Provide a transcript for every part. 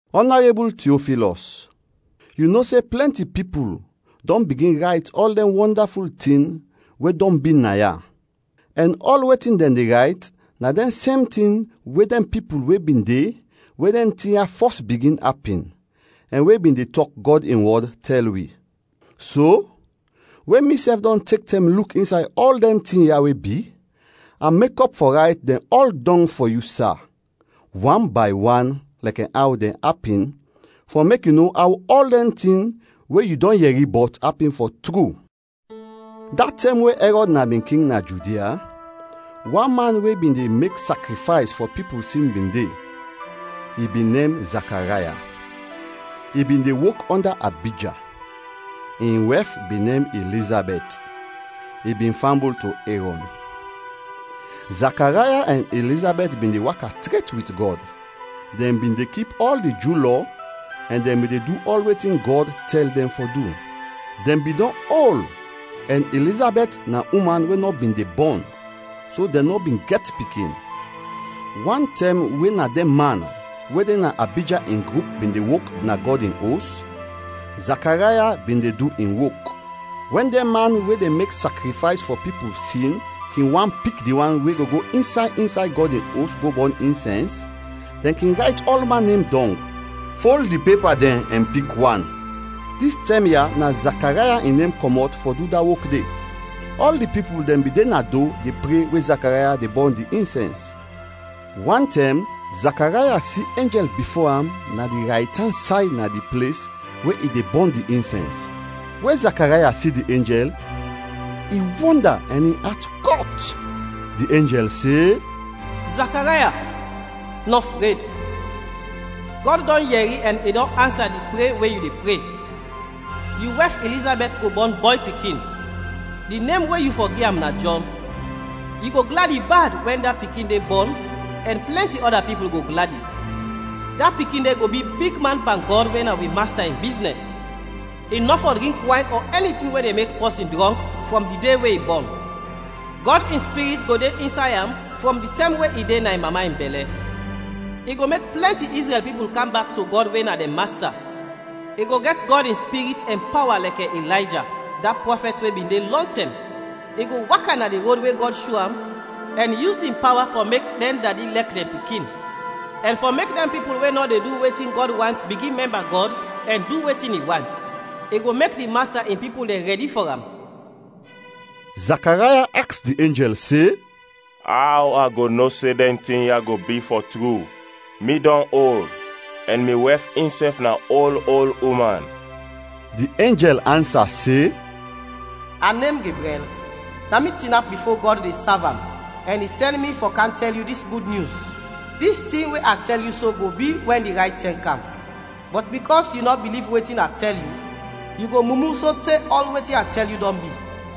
Ɔnarebul Tiofilɔs, yu no se plɛnti pipul dɔn bigin rayt ɔl dɛn wɔndaful tin we dɔn bi naya. Ɛn ɔl wetin dɛn de rayt na dɛn sem tin we dɛn pipul we bin de we dɛn tin ya fɔs bigin apin, ɛn we bin de tɔk Gɔd in wɔd, tɛl wi. So, we misɛf dɔn tek tɛm luk insay ɔl dɛn tin ya we bi, a mekɔp fɔ rayt dɛn ɔl dɔng fɔ yu, sa, wan bay wan lɛkɛ aw dɛn apin, fɔ mek yu no aw ɔl dɛn tin we yu dɔn yɛri bɔt, apin fɔ tru. Da tɛm we Ɛrɔd na bin King na Judia, wan man we bin de mek sakrifays fɔ pipul sin bin de. I bin nem Zakaraya; i bin de wok ɔnda Abija. In wɛf bin nem Ilizabɛt, i bin fambul to Erɔn. Zakaraya ɛn Ilizabɛt bin de waka tret wit Gɔd. Dɛn bin de kip ɔl di Ju Lɔ ɛn dɛn bin de du ɔl wetin Gɔd tɛl dɛn fɔ du. Dɛn bin dɔn ol ɛn Ilizabɛt na uman we nɔ bin de bɔn, so dɛn nɔ bin gɛt pikin. Wan tɛm we na dɛn man we de na Abija in grup bin de wok na Gɔd in Os, Zakaraya bin de du in wok. Wɛn dɛn man we de mek sakrifays fɔ pipul sin kin want pik di wan we go go insay insay Gɔd in Os go bɔn insɛns, dɛn kin rayt ɔlman nem dɔng, fol di pepa dɛn ɛn pik wan; dis tɛm ya na Zakaraya in nem kɔmɔt fɔ du da wok de. Ɔl di pipul dɛn bin de na do de pre we Zakaraya de bɔn di insɛns. Wantɛm, Zakaraya si enjɛl bifo am na di raytan say na di ples, we i de bɔn di insɛns. We Zakaraya si di enjɛl, i wɔnda ɛn in at kɔt. Di enjɛl se, “Zakaraya, nɔ fred! Gɔd dɔn yɛri ɛn i dɔn ansa di pre we yu de pre; yu wɛf Ilizabɛt go bɔn bɔy pikin; di nem we yu fɔ gi am na Jɔn. Yu go gladi bad wɛn da pikin de bɔn ɛn plɛnti ɔda pipul go gladi! Da pikin de go bi bigman pan Gɔd we na wi Masta in biznɛs. I nɔ fɔ drink wayn ɔ ɛni tin we de mek pɔsin drɔnk frɔm di de we i bɔn. Gɔd in Spirit go de insay am frɔm di tɛm we i de na in mama bɛlɛ. I go mek plɛnti Izrɛl pipul kam bak to Gɔd we na dɛn Masta. I go gɛt Gɔd in Spirit ɛn pawa lɛkɛ Ilayja, da prɔfɛt we bin de lɔntɛm. I go waka na di rod we Gɔd sho am ɛn yus in pawa fɔ mek dɛn dadi lɛk dɛn pikin; ɛn fɔ mek dɛn pipul we nɔ de du wetin Gɔd want bigin mɛmba Gɔd ɛn du wetin i want; i go mek di Masta in pipul dɛn rɛdi fɔ am.” Zakaraya aks di enjɛl se, “Aw a go no se dɛn tin ya go bi, fɔ tru? Mi dɔn ol, ɛn mi wɛf insɛf na ol ol uman.” Di enjɛl ansa se, “A nem Gebrɛl. Na mi tinap bifo Gɔd de sav am ɛn i sɛn mi fɔ kam tɛl yu dis gud nyus. Dis tin we a tɛl yu so go bi, wɛn di rayt tɛm kam. Bɔt bikɔs yu nɔ biliv wetin a tɛl yu, yu go mumu sote ɔl wetin a tɛl yu dɔn bi.”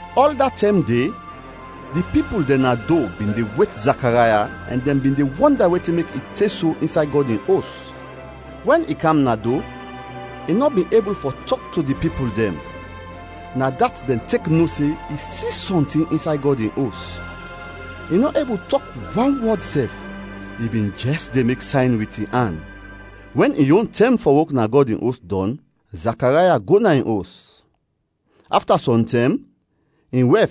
Ɔl da tɛm de, di pipul dɛn na do bin de wet Zakaraya ɛn dɛn bin de wɔnda wetin mek i te so insay Gɔd in Os. Wɛn i kam na do, i nɔ bin ebul fɔ tɔk to di pipul dɛn, na dat dɛn tek no se i si sɔntin insay Gɔd in Os. I nɔ ebul tɔk wan wɔd sɛf, i bin jɛs de mek sayn wit in an. Wɛn in yon tɛm fɔ wok na Gɔd in Os dɔn, Zakaraya go na in os. Afta sɔm tɛm, in wɛf,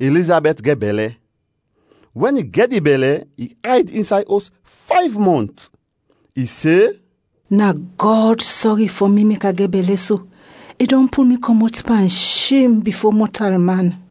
Ilizabɛt gɛt bɛlɛ; wɛn i gɛt di bɛlɛ i ayd insay os fayv mɔnt. I se, “Na Gɔd sɔri fɔ mi mek a gɛt bɛlɛ so, i dɔn pul mi kɔmɔt pan shem bifo mɔtalman.”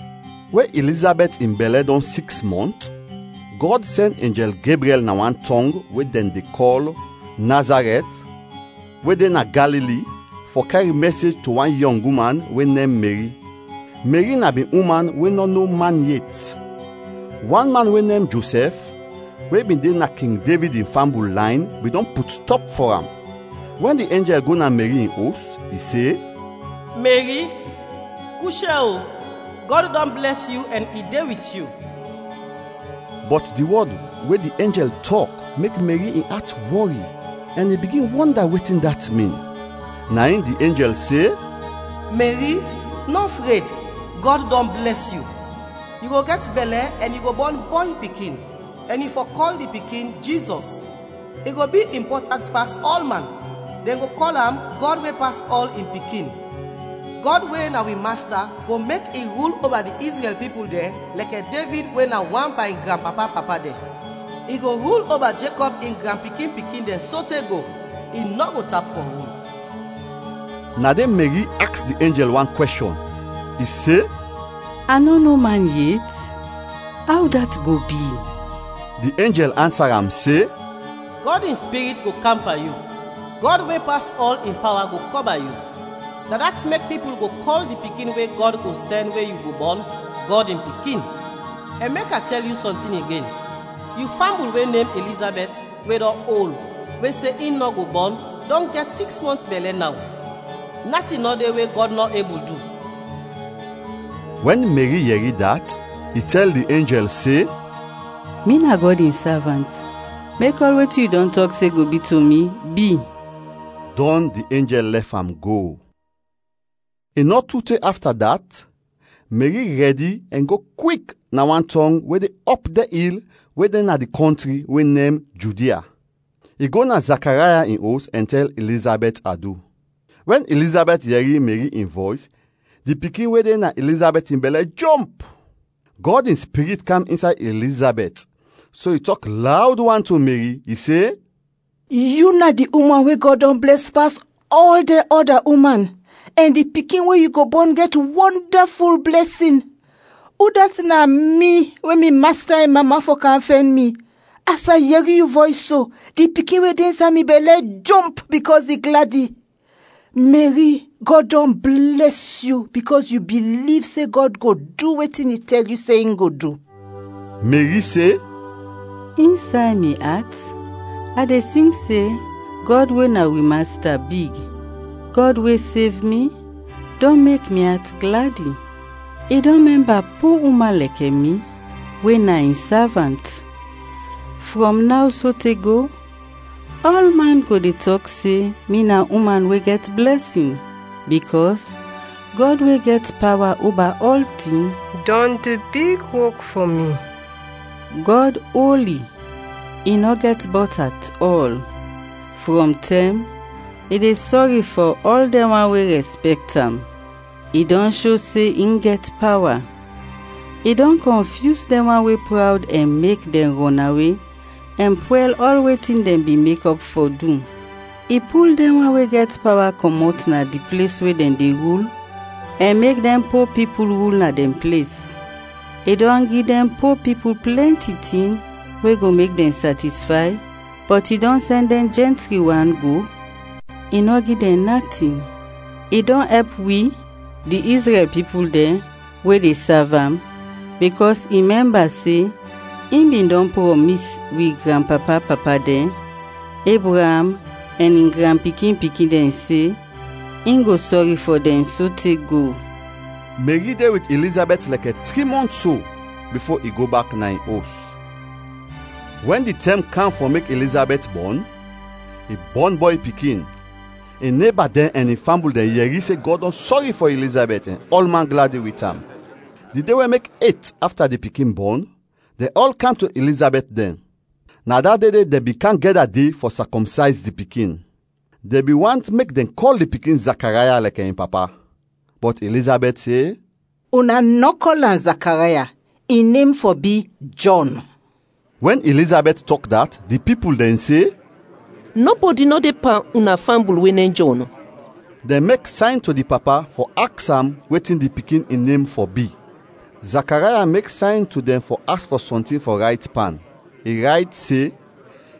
We Ilizabɛt in bɛlɛ dɔn siks mɔnt, Gɔd sɛn enjɛl Gebrɛl na wan tɔng we dɛn kɔl Nazarɛt we de na Galili fɔ kɛr mɛsej to wan yɔng uman we nem Meri. Meri na bin uman we nɔ no man yet. Wan man we nem Josɛf, we bin de na King Devid in fambul layn bin dɔn put stɔp fɔ am. Wɛn di enjɛl go na Meri in os, i se, “Meri, kushɛ, o! Gɔd dɔn blɛs yu ɛn i de wit yu!” Bɔt di wɔd we di enjɛl tɔk mek Meri in at wɔri, ɛn i bigin wɔnda wetin dat min. Na in di enjɛl se, “Meri, nɔ fred, Gɔd dɔn blɛs yu. Yu go gɛt bɛlɛ ɛn yu go bɔn bɔy pikin, ɛn yu fɔ kɔl di pikin, Jizɔs. I go bi impɔtant pas ɔlman, dɛn i go kɔl am Gɔd we pas ɔl, in Pikin. Gɔd we na wi Masta go mek i rul oba di Izrɛl pipul dɛn lɛkɛ Devid we na wan pan in granpapa-papa dɛn. I go rul oba Jekɔb in granpikin-pikin dɛn sote go; i nɔ go tap fɔ rul!” Na de Meri aks di ɛnjel wan kwɛshɔn. I se, “A nɔ no man yet. Aw dat go bi?” Di enjɛl ansa am se, “Gɔd in Spirit go kam pan yu, Gɔd we pas ɔl in pawa go kɔba yu. Na dat mek pipul go kɔl di pikin we Gɔd go sɛn we yu go bɔn, Gɔd in Pikin. Ɛn mek a tɛl yu sɔntin igen, yu fambul we nem Ilizabɛt, we dɔn ol, we se in nɔ go bɔn, dɔn gɛt siks mɔnt bɛlɛ naw. Natin nɔ de we Gɔd nɔ ebul du!” Wɛn Meri yɛri dat, i tɛl di enjɛl se, “Mi na Gɔd in savant, mek ɔl wetin yu dɔn tɔk se go bi to mi, bi.” Dɔn di enjɛl lɛf am go. I nɔ tu te afta dat, Meri rɛdi ɛn go kwik na wan tɔng we de ɔp dɛn il we de na di kɔntri we nem Judia. I go na Zakaraya in os ɛn tɛl Ilizabɛt adu. Wɛn Ilizabɛt yɛri Meri in vɔys, di pikin we de na Ilizabɛt in bɛlɛ jomp. Gɔd in Spirit kam insay Ilizabɛt, so i tɔk lawd wan to Meri. I se, “Yu na di uman we Gɔd dɔn blɛs pas ɔl dɛn ɔda uman ɛn di pikin we yu go bɔn gɛt wɔndaful blɛsin! Udat na mi we mi Masta in mama fɔ kam fɛn mi? As a yɛri yu vɔys so, di pikin we de insay mi bɛlɛ jomp bikɔs i gladi. Meri, Gɔd dɔn blɛs yu bikɔs yu biliv se Gɔd go du wetin i tɛl yu se in go du.” Meri se, “Insay mi at a de sing se Gɔd we na wi Masta, big. Gɔd we sev mi dɔn mek mi at gladi. I dɔn mɛmba po uman lɛkɛ mi, we na in savant. Frɔm naw sote go ɔlman go de tɔk se mi na uman we gɛt blɛsin, bikɔs Gɔd we gɛt pawa oba ɔltin dɔn du big wok fɔ mi. Gɔd oli, i nɔ gɛt bɔt at ɔl; frɔm tɛm, i de sɔri fɔ ɔl dɛn wan we rɛspɛkt am. I dɔn sho se in gɛt pawa, i dɔn kɔnfyus dɛn wan we prawd ɛn mek dɛn rɔnawe ɛn pwɛl ɔl wetin dɛn bin mekɔp fɔ du. I pul dɛn wan we gɛt pawa kɔmɔt na di ples we dɛn de rul ɛn mek dɛn po pipul rul na dɛn ples. I dɔn gi dɛn po pipul plɛnti tin we go mek dɛn satisfay, bɔt i dɔn sɛn dɛn jɛntri wan go, i nɔ gi dɛn natin. I dɔn ɛp wi, di Izrɛl pipul dɛn, we de sav am, bikɔs i mɛmba se in bin dɔn prɔmis wi granpapa-papa dɛn, Ebraam ɛn in granpikin-pikin dɛn se in go sɔri fɔ dɛn sote go!” Meri de wit Ilizabɛt lɛkɛ tri mɔnt so bifo i go bak na in os. Wɛn di tɛm kam fɔ mek Ilizabɛt bɔn, i bɔn bɔy pikin. In neba dɛn ɛn in fambul dɛn yɛri se Gɔd dɔn sɔri fɔ Ilizabɛt ɛn ɔlman gladi wit am. Di de we mek et afta di pikin bɔn, dɛn ɔl kam to Ilizabɛt dɛn; na da de de dɛn bin kam gɛda de fɔ sakɔmsayz di pikin. Dɛn bin want mek dɛn kɔl di pikin Zakaraya lɛkɛ in papa. Bɔt Ilizabɛt se, “Una nɔ kɔl am Zakaraya, in nem fɔ bi Jɔn.” Wɛn Ilizabɛt tɔk dat, di pipul dɛn se, “Nɔbɔdi nɔ de pan una fambul we nem Jɔn!” Dɛn mek sayn to di papa fɔ aks am wetin di pikin in nem fɔ bi. Zakaraya mek sayn to dɛn fɔ aks fɔ sɔntin fɔ rayt pan, i rayt se,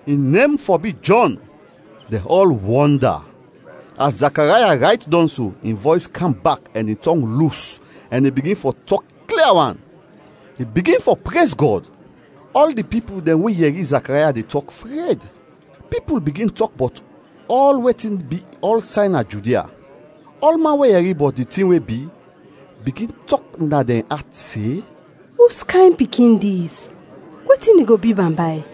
“In nem fɔ bi Jɔn!” Dɛn ɔl wɔnda! As Zakaraya rayt dɔn so, in vɔys kam bak ɛn in tɔng lus ɛn i bigin fɔ tɔk klia wan. I bigin fɔ prez Gɔd. Ɔl di pipul dɛn we yɛri Zakaraya de tɔk, fred. Pipul bigin tɔk bɔt ɔl wetin bi ɔlsay na Judia. Ɔlman we yɛri bɔt di tin we bi, bigin tɔk na dɛn at se, “Uskayn pikin dis? Wetin i go bi bambay?”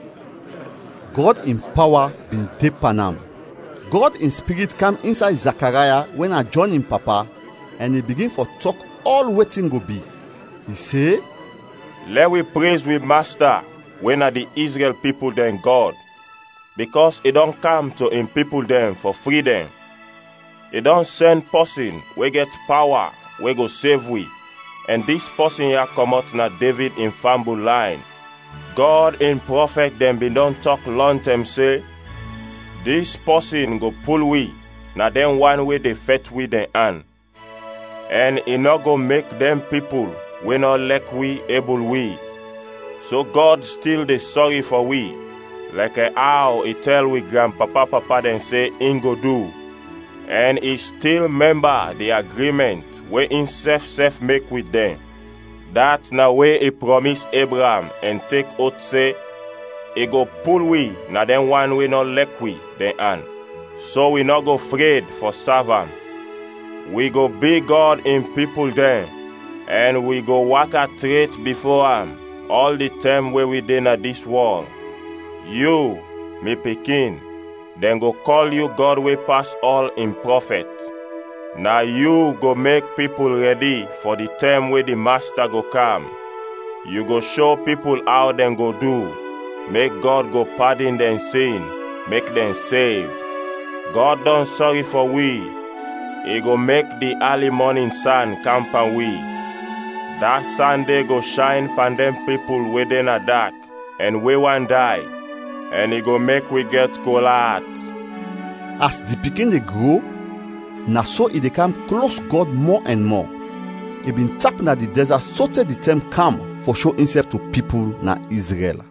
Gɔd in pawa bin de pan am. Gɔd in Spirit kam insay Zakaraya we na Jɔn in papa, ɛn i bigin fɔ tɔk ɔl wetin go bi. I se: “Lɛ wi prez wi Masta we na di Izrɛl pipul dɛn Gɔd, bikɔs i dɔn kam to in pipul dɛn fɔ fri dɛn. I dɔn sɛn pɔsin we gɛt pawa we go sev wi ɛn dis pɔsin ya kɔmɔt na Devid in fambul layn. Gɔd in prɔfɛt dɛn bin dɔn tɔk lɔntɛm se dis pɔsin go pul wi na dɛn wan we de fɛt wi dɛn an, ɛn i nɔ go mek dɛn pipul we nɔ lɛk wi ebul wi. So Gɔd stil de sɔri fɔ wi lɛkɛ aw i tɛl wi granpapa-papa dɛn se in go du ɛn i stil mɛmba di agrimɛnt we insɛf sɛf mek wit dɛn, dat na we i prɔmis Ebraam ɛn tek oth se in go pul wi na dɛn wan we nɔ lɛk wi, dɛn an, so wi nɔ go fred fɔ sav am, wi go bi Gɔd in pipul dɛn ɛn wi go waka tret bifo am ɔl di tɛm we wi de na dis wɔl. Yu, mi pikin, dɛn go kɔl yu Gɔd we pas ɔl, in prɔfɛt. Na yu go mek pipul rɛdi fɔ di tɛm we di Masta go kam; yu go sho pipul aw dɛn go du, mek Gɔd go padin dɛn sin, mek dɛn sev. Gɔd dɔn sɔri fɔ wi; i go mek di ali mɔnin san kam pan wi. Da san de go shayn pan dɛn pipul we de na dak ɛn we want day, ɛn i go mek wi gɛt kol at.” As di pikin de gro, na so i de kam klos Gɔd mɔ ɛn mɔ. I bin tap na di dɛzat sote di tɛm kam fɔ sho insɛf to pipul na Izrɛl.